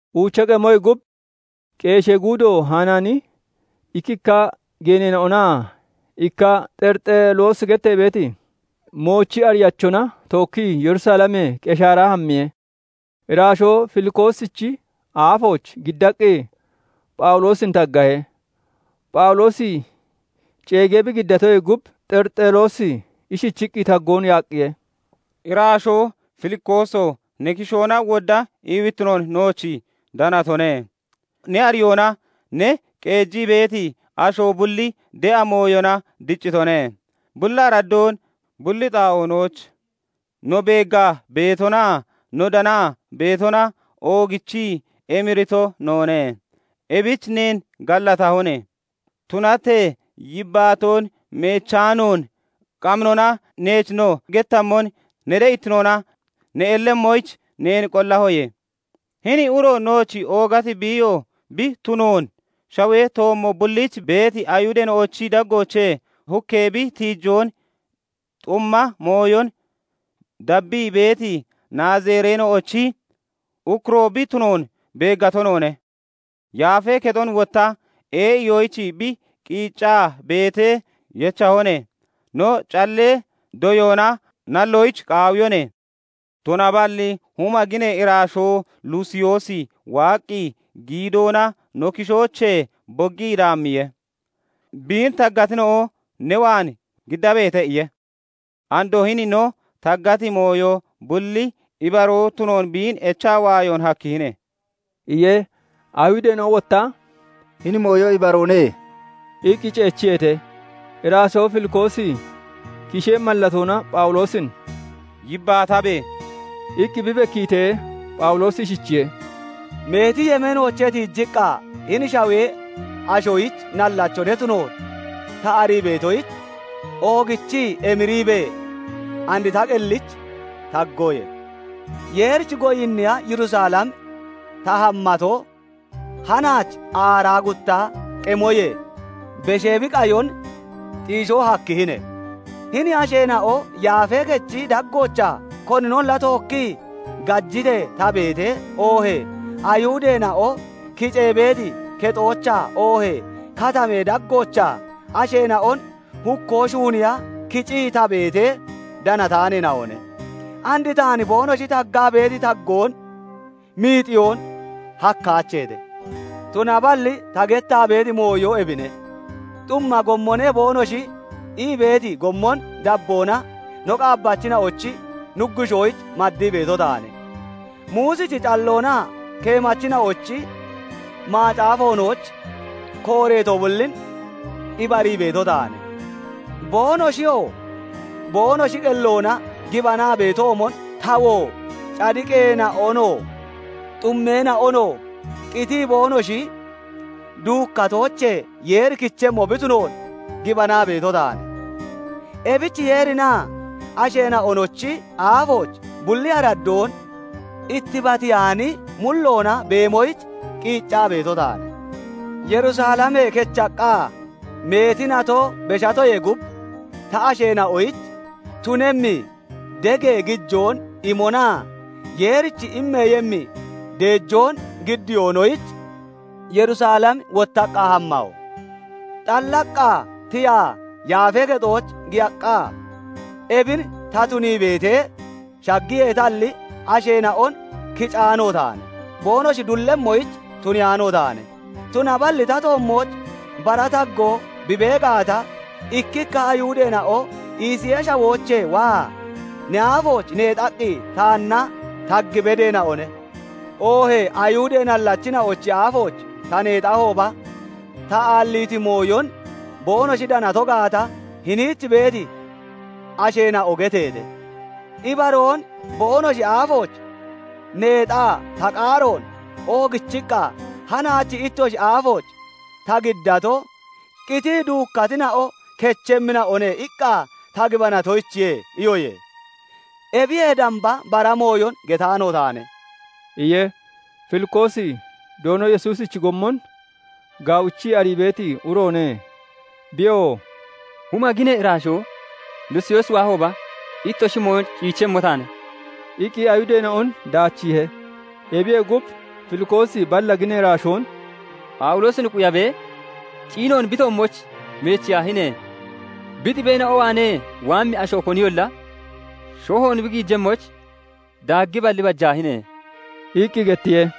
Uucha qemoyee gub, qeeshee guudo Hanaani ikkikka geeneena'onaa ikka Xerixeloosi gettee beeti moochi ariyachona tookkii Yerusalemee Qeshaara hammiye; iraashoo Filikoosichi aafooch giddaqqi, Phawuloosin taggaheete. Phawuloosi ceegee bi giddatoyee gub, Xerixeloosi ishichiqqi taggoon yaaqqiye:- "Iraashoo Filikooso! Ne kishoona wodda iiwittino nooch danatone; ne ariyoona ne qeejii beeti asho bulli de'a mooyona diccitone. Bulli araddoon bulli xaa'oonooch no beeggaa beetonaa no danaa beetona oogichii emirito noone; ebich neen gallatahone. Tunatee yibbaatoon meechaanoon qaminoona neech no gettammon ne de'ittinoona ne ellemmoyich neen qollahoye. "Hini uro nooch oogati biiyo bi tunoon, shawee toommo bulliich beeti Ayihudeena'ochi daggooch hukkee bi tiijoon, xumma mooyon dabbii beeti Naazireena'ochi ukkuroo bi tunoon beeggato noone. Yaafee Kexon wotta ee'iyoyich bi qiiccaa beetee yechahone. No callee doyoona nalloyich qaawiyone; tunaballi huma ginee iraashoo Lusiyoosi waaqqi, giidoona no kishoochee boggii daammiye; "Biin taggatina'o ne waan giddabeete" iye. Andoo hini no taggati mooyo bulli ibaroo tunoon biin echaa waayo hakkihine" iye. Ayihudeena'o wotta "Hini mooyo ibaroone" iqqi ceechiyeete. Iraashoo Filikoosi kishee mallatoona Phawuloosin "Yibbaatabe!" iqqi bi bekkiitee, Phawuloosi ishichiye:- "Meeti yemeenoochee tiijiqqa hini shawee ashoyich nallacho ne tunoon ta arii beetoyich, oogichii emiriibee and ta qellich taggoye. Yeerich goyinniya Yerusalem ta hammato, hanaach aaraa gutta qemoyee beshee bi qayon xiishoo hakkihine. Hini asheena'o Yaafee Kechi daggoochaa koninolla tookkii gajitee ta beetee, oohee Ayihudeena'o kicee beeti kexoochaa oohee katamee daggoochaa asheena'on hukkoo shuuniiya kicii ta beetee danataaneena'one. And taan boonoshi taggaa beeti taggoon miixiyoon hakkaacheete. Tunaballi ta gettaa beeti mooyo ebine:- 'Xumma gommone' boonoshi ii beeti gommon dabboona no qaabbachina'ochi Nuggushoyich maddii beeto taane; Muusichi calloonaa keemachina'ochi macaafoonooch kooreeto bullin ibarii beeto taane. Boonoshiyoo boonoshi qelloona gibanaa beetoomon tawoo cadiqeena'onoo, xummeena'onoo qitii boonoshi duukkatoochee Yeeri kichemmo bi tunoon gibanaa beeto taane. Ebich Yeerinaa asheena'onochi aafooch bulli araddoon ittibatiyaani mulloona beemoyich qiiccaa beeto taane. Yerusalemee kechaqqa meeti nato beshatoyee gub, ta shiisheena'oyich tunemmi degee gijoon imonaa Yeerich immeeyemmi deejoon giddiyoonoyich Yerusalem wottaqqa hammaho. Xallaqqa tiyaa Yaafee Kexooch giyaqqa, ebin ta tunii beetee shaggiyeetalli, asheena'on kicaano taane; boonoshi dullemmoyich tuniyaano taane. Tunaballi ta toommooch bara taggoo bi bee gaata, ikkikka Ayihudeena'o Isiyee Shawoochee waa ne aafooch neexaqqi taanna tag bedeena'one. Oohee Ayihudee nallachina'ochi aafooch ta neexahooba, ta aalliiti mooyon boonoshi danato gaata hiniich beeti asheena'o geteete. Ibaroon boonoshi aafooch neexaa ta qaaroon oogichiqqa, 'Hanaach ittoshi aafooch ta giddato, "Qitii duukkatina'o kechemmina'one" iqqa ta gibanatoyichiye' iyoye. Ebiyee damba bara mooyon getaano taane" iye. Filikoosi Doono Yesuusichi gommon gaawichii arii beeti uroone; Biyoo "Huma ginee iraashoo Lusiyoosi waahooba, ittoshi mooyon ciichemmo taane" iqqi Ayihudeena'on daachiihe. Ebiyee gub, Filikoosi balla ginee iraashoon "Phawuloosin quyabee ciinoon bi toommooch meechiyaahine! Bi xibeena'o waanee waammi asho koniyolla shohoon bi giijemmoyich daaggiballi, bajaahine!" iqqi gettiye.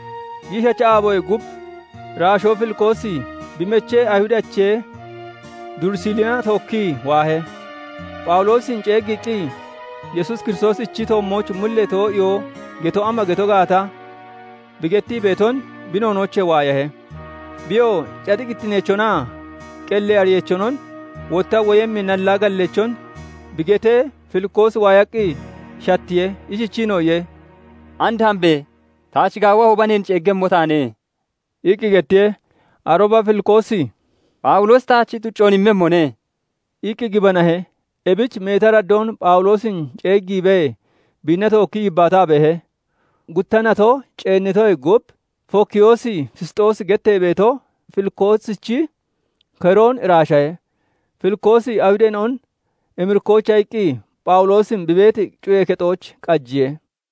Giishacha aaboyee gub iraashoo Filikoosi bi mechee Ayihudache Durisilina tookkii waahe; Phawuloosin ceeggiiqqi, Yesuus Kiristoosichi toommooch mullee too'iyoo geto ama geto gaata bi gettii beeton bi noonoochee waayahe. Biyoo cadiqittineechonaa qellee ariyeechonon, wotta woyemmi nallaa galleechon bi getee Filikoosi waayaqqi shattiye; ishichiinoo iye:- "And hambe! Taach gaawahooba, neen ceeggiiyemmo taane" iqqi gettiye. Arooba Filikoosi "Phawuloosi taach xuccoon immemmone" iqqi gibanahe; ebich meeti araddoon Phawuloosin ceeggiibee, biinna tookkii yibbaataa beehe. Gutta nato ceennitoyee gub, Fokiyoos Fisxoosi gettee beeto Filikoosichi keroon iraashahe. Filikoosi Ayihudeena'on emirikkoyicha iqqi, Phawuloosin bi beeti cuyee kexooch qajiye.